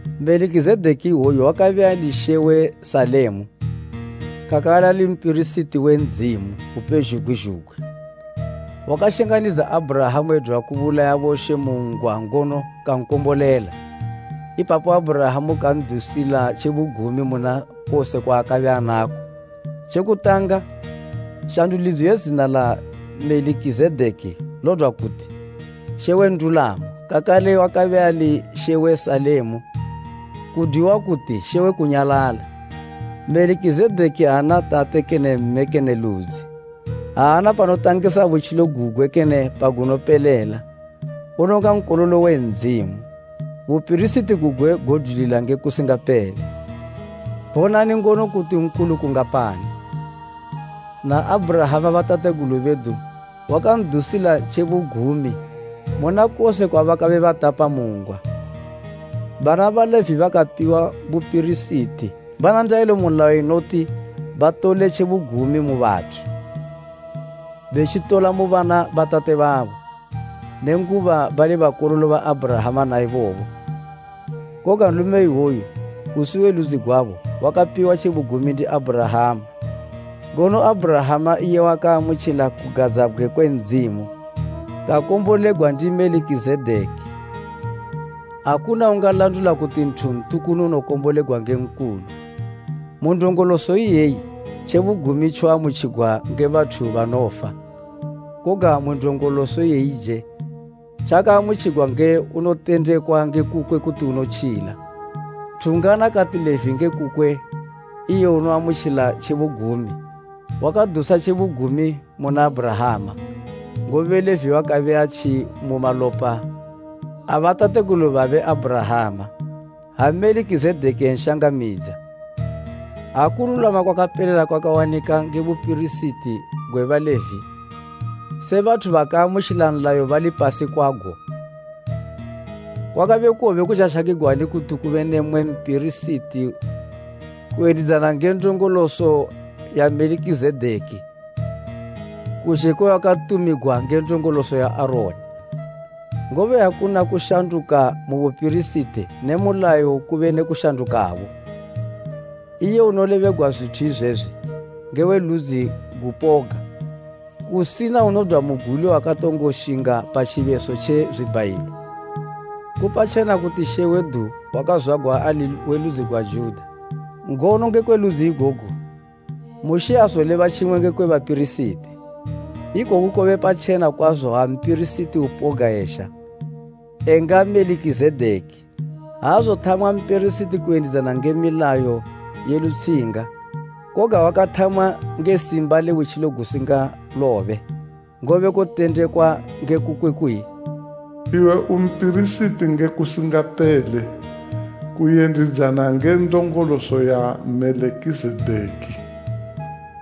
Melikizedeki iwoyu wakabe ali mambo we Salema, kakale ali mpirisiti we Ndzimu Upezhugwi zhugwi wakashanganidza Abhurahama edwa kubulaya bomambo mu ngwa ngono kankombolela, ipapo Abhurahama kan'dusila tjebugumi muna kose kwaakabe anako. Tje kutanga shandulidzo ye zina la Melikizedeki lodwa kuti, “Mambo we ndulamo;” kakale wakabe ali mambo we Salema, kudwiwa kuti, “Mambo we kunyalala.” Melikizedeki aana tate kene mme kene ludzi, aana panotangisa butjilo gugwe kene pagunopelela, unonga Nkololo we Ndzimu, bupirisiti gugwe godwilila nge kusingapele. Bonani ngono kuti nkulu kungapani! Na Abhurahama batategulu bedu wakan'dusila tjebugumi muna kose kwabakabe batapa mu ngwa. Bana ba Levi bakapiwa bupirisiti bana ndayilo mu nlayo inoti batole tjebugumi mu bathu, betjitola mu bana batate babo, nenguba bali bakololo ba Abhurahama naibobo. Koga nlume iwoyu usi we ludzi gwabo, wakapiwa tjebugumi ndi Abhurahama, ngono Abhurahama iye wakaamutjila kugadzabgwe kwe Ndzimu, kakombolegwa ndi Melikizedeki. Akuna ungalandula kuti nthu ntukunu unokombolegwa nge nkulu. Mu ndongoloso iyeyi tjebugumi tjoamutjigwa nge bathu banofa, koga mu ndongoloso iyeyije tjakaamutjigwa nge unotendekwa nge kukwe kuti unotjila. Nthu ungana kati Levi nge kukwe iye unoamutjila tjebugumi, wakadusa tjebugumi muna Abhurahama; ngobe Levi wakabe atji mu malopa a batategulu babe Abhurahama, ha Melikizedeki enshangamidza. Ha kululwama kwakapelela kwawanika nge bupirisiti gwa Levi, se bathu bakaamutjila nlayo balipasi gwago, kwakabe kowobe kutjashakigwani kuti kube ne mmwe mpirisiti kuyendidzana nge ndongoloso ya Melikizedeki kuzhe kwe wakatumigwa nge ndongoloso ya Aroni? Ngobe ha kuna kushanduka mu bupirisiti ne mu nlayo kube ne kushandukabo. Iye unolebegwa zwithu izwezwi, nge we ludzi gupoga, kusina unodwa mu guli wakatongo shinga pa tjibeso tje zwibhayilo. Ku patjena kuti She wedu wakazwagwa ali we ludzi gwa Juda, ngono ngekwe ludzi igogo, Mushe aazoleba tjimwe ngekwe bapirisiti. Ikoku kobe patjena kwazo ha mpirisiti upoga ezha, enga Melikizedeki. Aazothamwa mpirisiti kuyendidzana nge milayo ye lutshinga, koga wakathamwa nge simba le butjilo gusingalobe. Ngobe kotendekwa nge kukwe kuyi, “Iwe u mpirisiti nge kusingapele, kuyendidzana nge ndongoloso ya Melikizedeki.”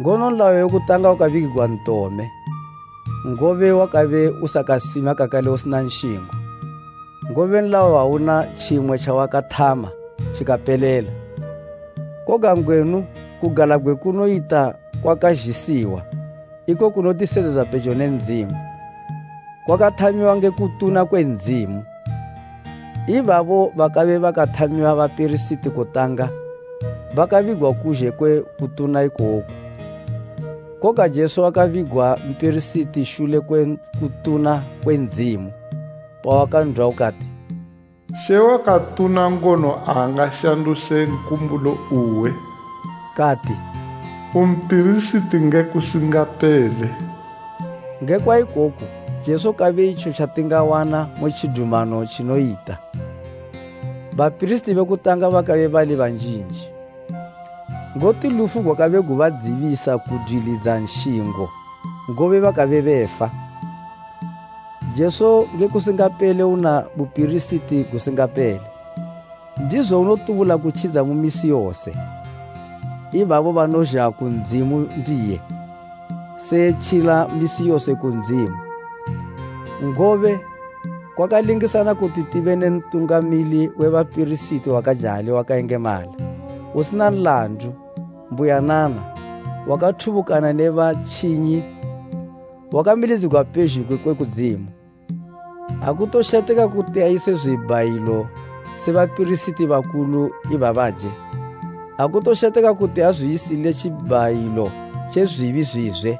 Ngono nlayo we kutanga wakabigigwa ntome, ngobe wakabe usakasima kakale usina nshingo. Ngobe nlayo awuna tjimwe tjawakathama tjikapelela. Koga ngwenu kugalabgwe kunoyita kwakazhisiwa, iko kunoti sedzedza pejo ne Ndzimu. Kwakathamiwa nge kutuna kwe Ndzimu. Ibabo bakabe bakathamiwa bapirisiti kutanga bakabigwa kuzhe kwe kutuna ikoku. Koga Jesu wakabigwa mpirisiti shule kwe kutuna kwe Ndzimu pawakan'dwa ukati, “She wakatuna ngono aangashanduse nkumbulo uwe.” Kati, “U mpirisiti nge kusingapele.” Ngekwa ikoku Jesu kabe itjo tjatingawana mu tjidumano tjinoyita. Bapirisiti be kutanga bakabe bali banjinji, ngoti lufu gwakabe gubadzibisa kudwilidza nshingo ngobe bakabe befa. Jesu nge kusingapele una bupirisiti gusingapele. Ndizo unotubula kutjidza mu misi yose, ibabo banozha ku Ndzimu ndiye, se etjila misi yose ku Ndzimu. Ngobe kwakalingisana kuti tibe ne mpirisiti nkulu wakajali wakayengemala, usina nlandu, mbuyanana, wakathubukana ne batjinyi wakamilidzigwa pezhugwi kwe kudzimu. Akutosheteka kuti ayise zwibhayilo se bapirisiti bakulu ibabaje, akutosheteka kuti azwiyisile tjibhayilo tje zwibi zwizwe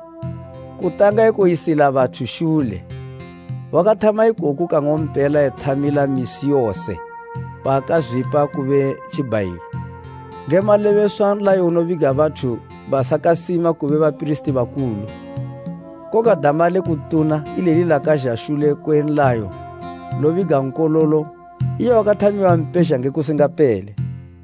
kutanga ekoyisila bathu shule; wakathama ikoku kang'ompela ethamila misi yose paakazwipa kube tjibhayilo. Nge malebeswa nlayo unobiga bathu basakasima kube bapirisiti bakulu, koga dama le kutuna ileli lakazha shule kwe nlayo lobiga Nkololo, iye wakathamiwa mpezha nge kusingapele.